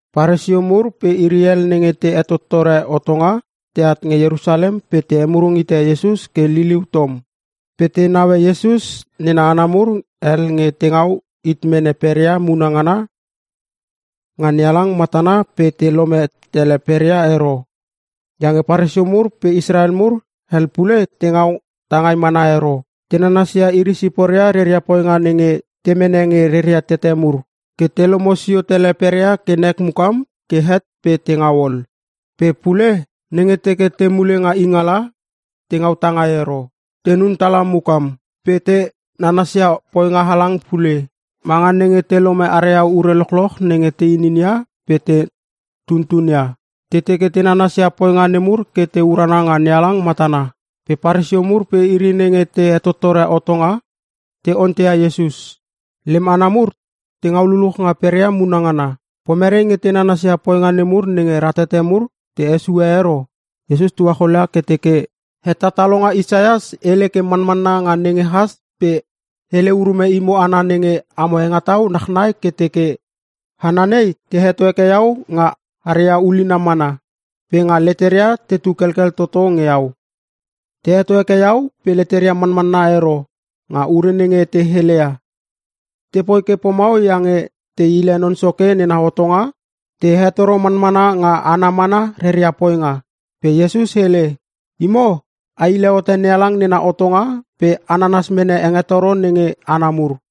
Paresio mur pe iri hel nenge te hetottore hotonga, teat nge Ierusalem pe te hemurung hite Iesus ke liliu tom. Pe te neue Iesus nena hana mur hel nge te ngau hit mene peria muna ngana nga NeHalang matana pe te lome tele peria ero. Iange Paresio mur pe Israel mur hel pule te ngau tangai mana ero. Te nanasia iri siporia reria poinga nenge te mene nge reria tete mur, ke te lomo sio tele peria ke nek mukam ke het pe te ngau ol. Pe pule, nenge teke te mule nga ingala, te ngau tangai ero. Tenun tala mukam. Pe te nanasia poinga halang pule, manga nenge te lome aria ure lochloch nenge te inin ia pe te tuntun ia. Te teke te nanasia poinga nemur ke te urana nga NeHalang matana. Pe Paresio mur pe iri nenge te hetottore hotonga, te onteia Iesus, “Lem hana mur te ngau luluch nga peria muna ngana. Pomere nge te nanasia poinga nemur nenge ratete mur te hesue ero?” Iesus tuacholia ke teke, “Hetatalonga Isaias hele ke manmanna nga nenge has pe hele urume imo hana nenge amo hengetau nachnai ke teke: “‘Hana nei te heto heke iau nga haria ulina mana pe nga leteria tetu kelkel toto nge iau. Te heto heke iau pe leteria manmanna ero nga ure nenge te heleia. Tepoi ke pomau iange te hile Non Soke nena hotonga pe te hetoro manmana nga hana mana reria poinga.’” Pe Iesus hele, “Imo a hile hote NeHalang nena hotonga pe a nanas mene hengetoro nenge hana mur.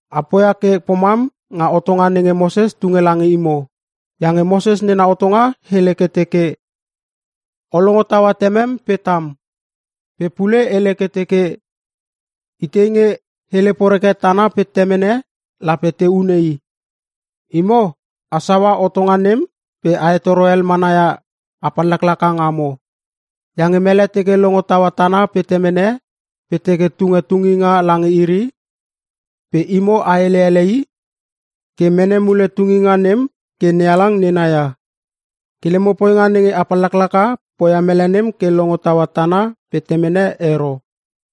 A poia ke pomam nga hotonga nenge Moses tunge lange imo. Iange Moses nena hotonga hele ke teke, ‘O longo taua temem pe tam.’ Pe pule hele ke teke, ‘Itei nge hele poreke tana pe temene, lape te hune i.’ Imo a saua hotonga nem pe a hetoro hel mana ia a pallaklaka ngamo. Iange mele teke longo taua tana pe temene pe teke tunge tunginga lange iri, pe imo a hele ele i ke mene mule tunginga nem ke NeHalang nena ia. Ke lemo poinga nenge a pallaklaka poia mele nem ke longo taua tana pe temene ero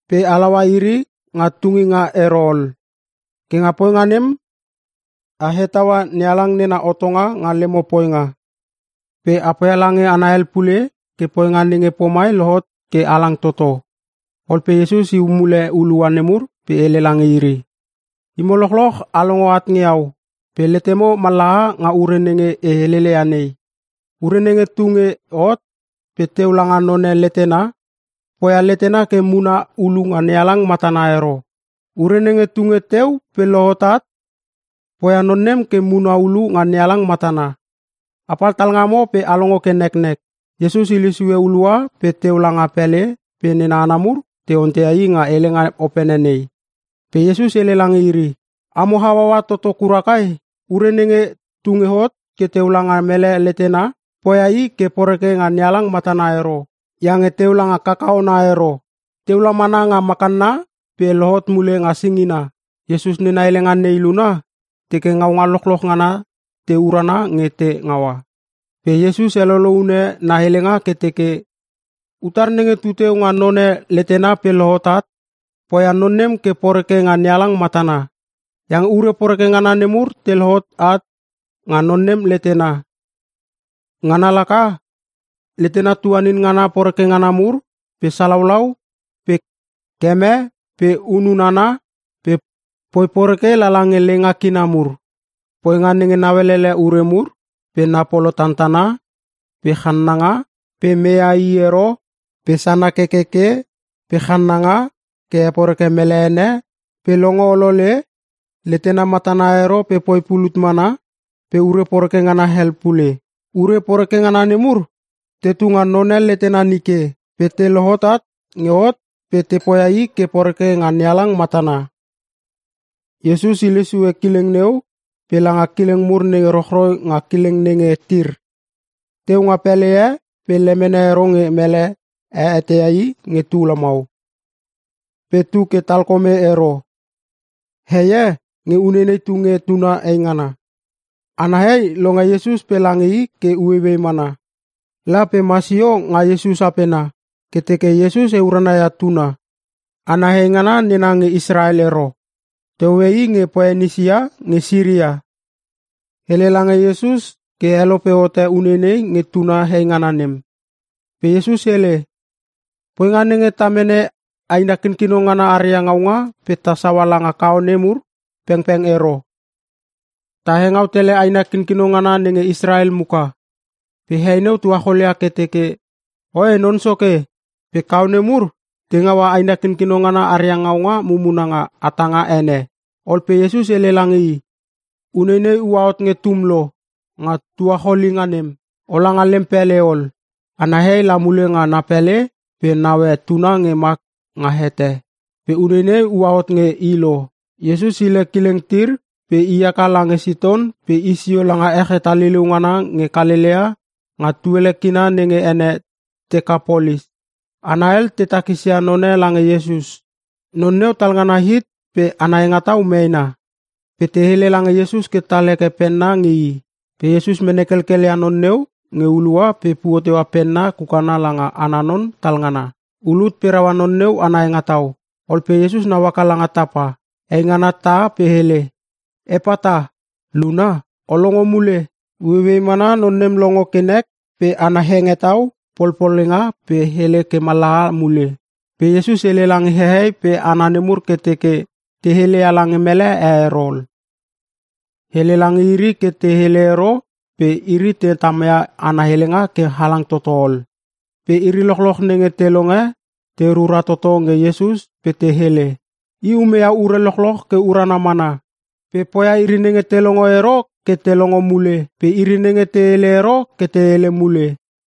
pe halaua iri nga tunginga ero ol. Ke nga poinga nem a hetaua NeHalang nena hotonga nga lemo poinga. Pe a poia lange hana hel pule ke poinga nenge pomai lohot ke halang toto.” Ol pe Iesus iu mule hulua nemur pe hele lange iri, “Imo lochloch a longo at nge iau pe letemo mallaha nga ure nenge e heleleia nei. Ure nenge tu nge hot pe teu langa none letena, poia letena ke muna ulu nga NeHalang matana ero. Ure nenge tu nge teu pe lohot at, poia non nem ke muna ulu nga NeHalang matana. Apal talngamo pe a longo ke neknek!” Iesus hile sue hulua pe teu langa pele pe nena hana mur te onteia i nga helenga opene nei. Pe Iesus hele lange iri, “Amo hauaua toto kura kai? Ure nenge tu nge hot ke teu langa mele letena poia i ke poreke nga NeHalang matana ero. Iange teu langa kakaona ero. Teu la mana nga makanna pe lohot mule nga singina.” (Iesus nena helenga nei luna, teke ngaunga lochloch ngana te urana nge te ngaua.) Pe Iesus helolo une na helenga ke teke, “Utar nenge tu teu nga none letena pe lohot at, poia non nem ke poreke nga NeHalang matana. Iange ure poreke ngana nemur te lohot at nga non nem letena. Ngana laka; letena tuanin ngana poreke ngana mur, pe salaulau pe keme pe hunun hana pe poi poreke lala nge leinga kina mur, poinga nenge naulele ure mur pe na polo tantana pe channanga pe meia iri ero pe sana kekeke pe channanga ke heporeke mele ene pe longo olole, letena matana ero pe poi pulut mana pe ure poreke ngana hel pule. Ure poreke ngana nemur tetu nga none letena nike pe te lohot at nge hot pe te poia i ke poreke nga NeHalang matana.” Iesus hile sue kileng neu pe langa kileng mur nenge rochroi nga kileng nenge Tir. Teu nga pele e pe lemene ero nge mele e eteia i nge tu lamau. Pe tu ke talkome ero. Hei e nge uneinei tu nge tuna heingana. Ana hei longe Iesus pe lange i ke ueiuei mana. La pe ma sio nga Iesus apena ke teke Iesus heurana ia tuna. Ana heingana nena nge Israel ero. Te hoe i nge Poenisia nge Siria. Hele lange Iesus ke helope hote uneinei nge tuna heingana nem. Pe Iesus hele, “Poinga nenge ta mene aina kinkino ngana aria ngaunga pe ta saua lange kaone mur pengpeng ero. Ta hengau tele aina kinkino ngana nenge Israel muka.” Pe hei neu tuacholia ke teke, “Oe Non Soke, pe kaone mur te ngaua aina kinkino ngana aria ngaunga mumuna nga hatanga ene!” Ol pe Iesus hele lange i, “Uneinei uahot nge tum lo nga tuacholinga nem. Ola nga lem pele ol.” Ana hei la mule nga na pele pe naue tuna nge ma nga hete. Pe uneinei ua hot nge i lo. Iesus hile kileng Tir pe i haka lange Siton pe i sio langa ech hetaliliu ngana nge Kalelea nga tuele kina nenge ene Tekapolis. Hana hel te takisia none lange Iesus. Non neu talngana hit pe ana hengetau meena. Pe te hele lange Iesus ke tal heke penna nge i. Pe Iesus mene kelkel ia non neu nge hulua pe puo teua penna kukana langa ana non talngana. Ulut pe raua non neu ana hengetau. Ol pe Iesus nau haka langa tapa, eingana tah pe hele, “Epata!” Luna, “O longo mule!” Ueiuei mana non nem longo ke nek pe ana hengetau polpolenga pe hele ke mallaha mule. Pe Iesus hele lange hehei pe hana nemur ke teke te heleia lange mele e ero ol. Hele lala nge iri ke te hele ero pe iri te tamia ana helenga ke halang tototo ol. Pe iri lochloch nenge te longe te rura toto nge Iesus pe te hele, “I umeia ure lochloch ke urana mana. Pe poia iri nenge te longo ero ke te longo mule pe iri nenge te hele ero ke te hele mule.”